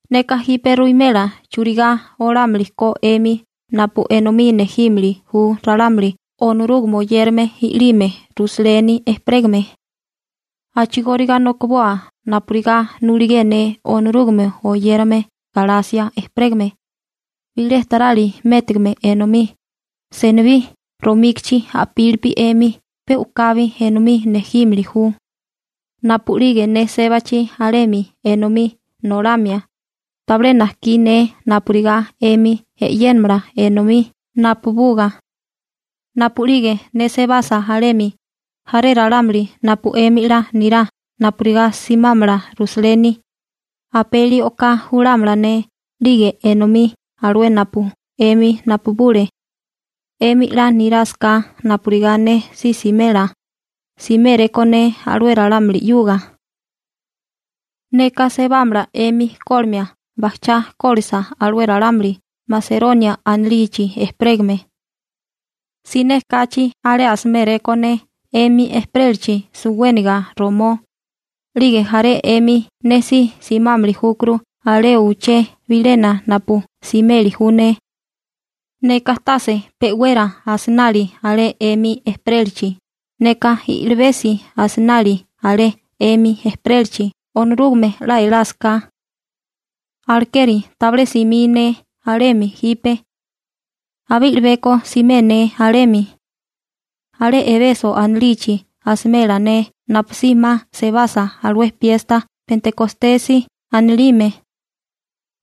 Neka jipe ruwimela churigá olámili ko 'emi napu enomí nejímili ju ralámuli Onorúgame oyérame i'lime Rusaleni ejperégame. A'chigóriga nokiboa napurigá nuligé ne Onorúgame oyérame Galasia ejperégame. Bilé tarali métigame enomí, senibí romíkichi a'pili 'emi pe u'kabi enomí nejímili ju. Napu'lige ne sébachi alemi enomí nolamia, tabilé najkí ne napurigá 'emi e'yénamala enomí napabuga. Napu'lige ne sebasa alemi, jaré ralámuli napu 'emi 'la nirá napurigá simámala Rusaleni, apeli o'ká julámala ne 'lige enomí alué napu 'emi napabule. 'Emi 'la nirásaká napurigá ne si simela, siméréko ne alué ralámuli 'yuga. Neka sebámala 'emi kólimia bajchá kólisa alué ralámuli Maseronia anilichi ejperégame. Siné kachi alé asiméréko ne 'emi ejperélachi suwéniga romó, 'lige jaré 'emi ne si simámili júkuru alé uché bilena napu simeli ju ne. Neka tase pe'wera asinali alé 'emi ejperélachi, neka i'libesi asinali alé 'emi ejperélachi Onorúgame 'la elásaká. Alekeri tabilé simí ne alemi jipe. Abé i'libeko simé ne alemi. Alé Ebeso anilichi asimela ne napusí 'ma sebasa alué piesta Pentekostesi anilime.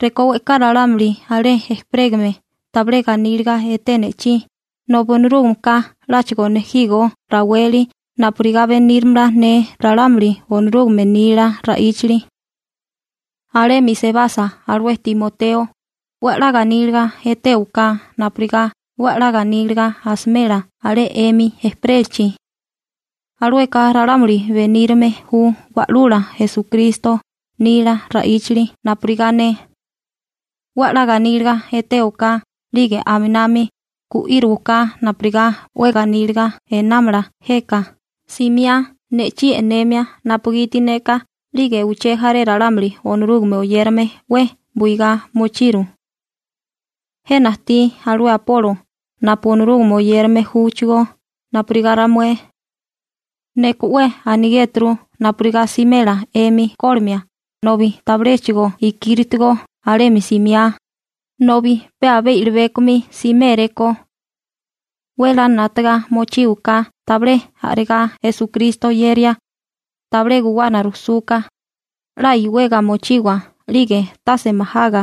Rekó we'ká ralámuli alé ejperégame tabilé ganíliga eté ne'chí nobi Onorúgameka 'láchigo nejígó raweli napurigá beníramala ne ralámuli Onorúgame nila ra'íchali. Alemi sebasa alué Timoteo, 'we 'la ganíliga etéwaká napurigá 'we 'la ganíliga asimela alé 'emi ejperélachi. Alueka ralámuli benírame ju Wa'lula Esukristo nila ra'íchali napurigá ne. 'We 'la ganíliga etéwaká 'lige aminami gu'írowaká napurigá 'we ganíliga einámala jeka simiá ne'chí e'nemia napugiti neka 'lige uché jaré ralámuli Onorúgame oyérame 'we buigá mochiru. Jena ajtí alué Apolo napu Onorúgame oyérame júchigó napurigá ramué. Neka 'we anigéturu napurigá simela 'emi kólimia nobi tabiléchigo ikíritigo alemi simiá, nobi pe abé i'libékomi siméréko. 'We 'la 'nátaga mochíwaká tabilé a'regá Esukristo oyeria, tabilé guwana rujsúká, 'la iwega mochiwa 'lige tase majaga.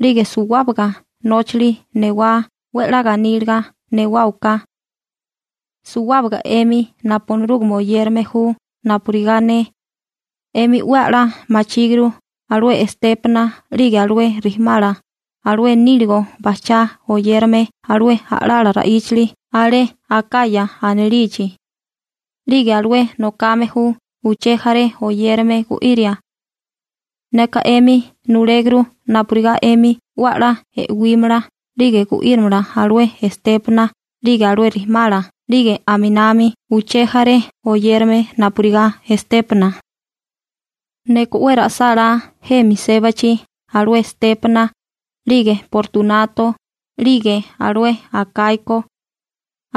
'Lige suwábaga nóchali newá 'we 'la ganíliga newáwaká. Suwábaga 'emi napu Onorúgame oyérame ju napurigá ne, 'emi 'we 'la machíguru alué Estépana 'lige alué rijimala alué níligo bajchá oyérame alué a'lala ra'íchali alé Akaya anilichi, 'lige alué nokame ju uché jaré oyérame gu'iria. Neka 'emi nuléguru napurigá 'emi 'we 'la e'wímala 'lige gu'írimala alué Estépana 'lige alué rijimala 'lige aminami uché jaré oyérame napurigá Estépana. Neka 'we ra'sálá jemi sébachi alué Estépana 'lige Portunato 'lige alué Akaiko.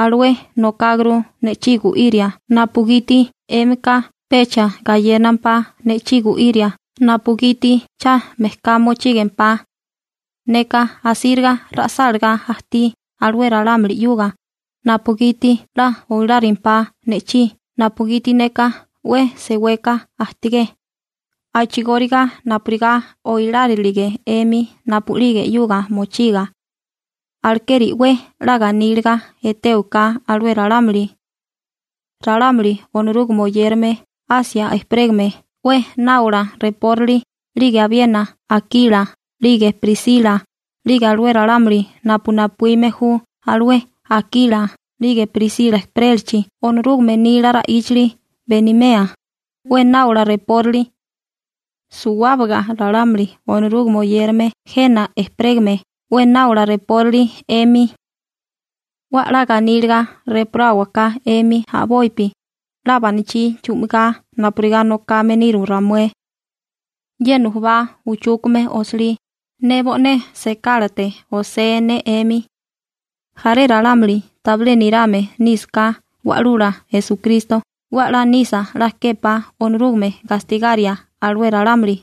Alué nokáguru ne'chí gu'iria napugiti 'émika pecha gayénampá ne'chí gu'íria napugiti cha mejká mochígempá. Neka asíriga ra'sálagá ajtí alué ralámuli 'yuga napugiti 'la oilárimpá ne'chí napugiti neka 'we seweka ajtigé, a'chigóriga napurigá oilárilige 'emi napu'lige 'yuga mochiga. Alekeri 'we 'la ganíliga etéwaká alué ralámuli. Ralámuli Onorúgame oyérame Asia ejperégame 'we náola rejpórali 'lige abiena Akila 'lige Prisila 'lige alué ralámuli napu napuíme ju alué Akila 'lige Prisila ejperélachi Onorúgame nila ra'íchali benimea, 'we náola rejpórali. Suwábaga ralámuli Onorúgame oyérame jena ejperégame 'we náola rejpórali 'emi. 'We 'la ganíliga rejporáwaká 'emi a'bopi 'la banachí chu'migá napurigá nokame niru ramué. Ye nujubá uchúkame osilí, ne bo'né sekálate osé ne 'emi. Jaré ralámuli tabilé nirame nísaká Wa'lula Esukristo 'we a'lá nisa 'la képá Onorúgame gastigaria alué ralámuli.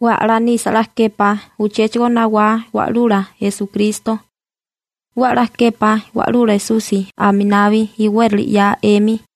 ¡'We a'lá nisa 'la képá uchéchigo nawá Wa'lula Esukristo! 'We a'lá képá Wa'lula Esusi aminabi iwérali 'ya 'emi.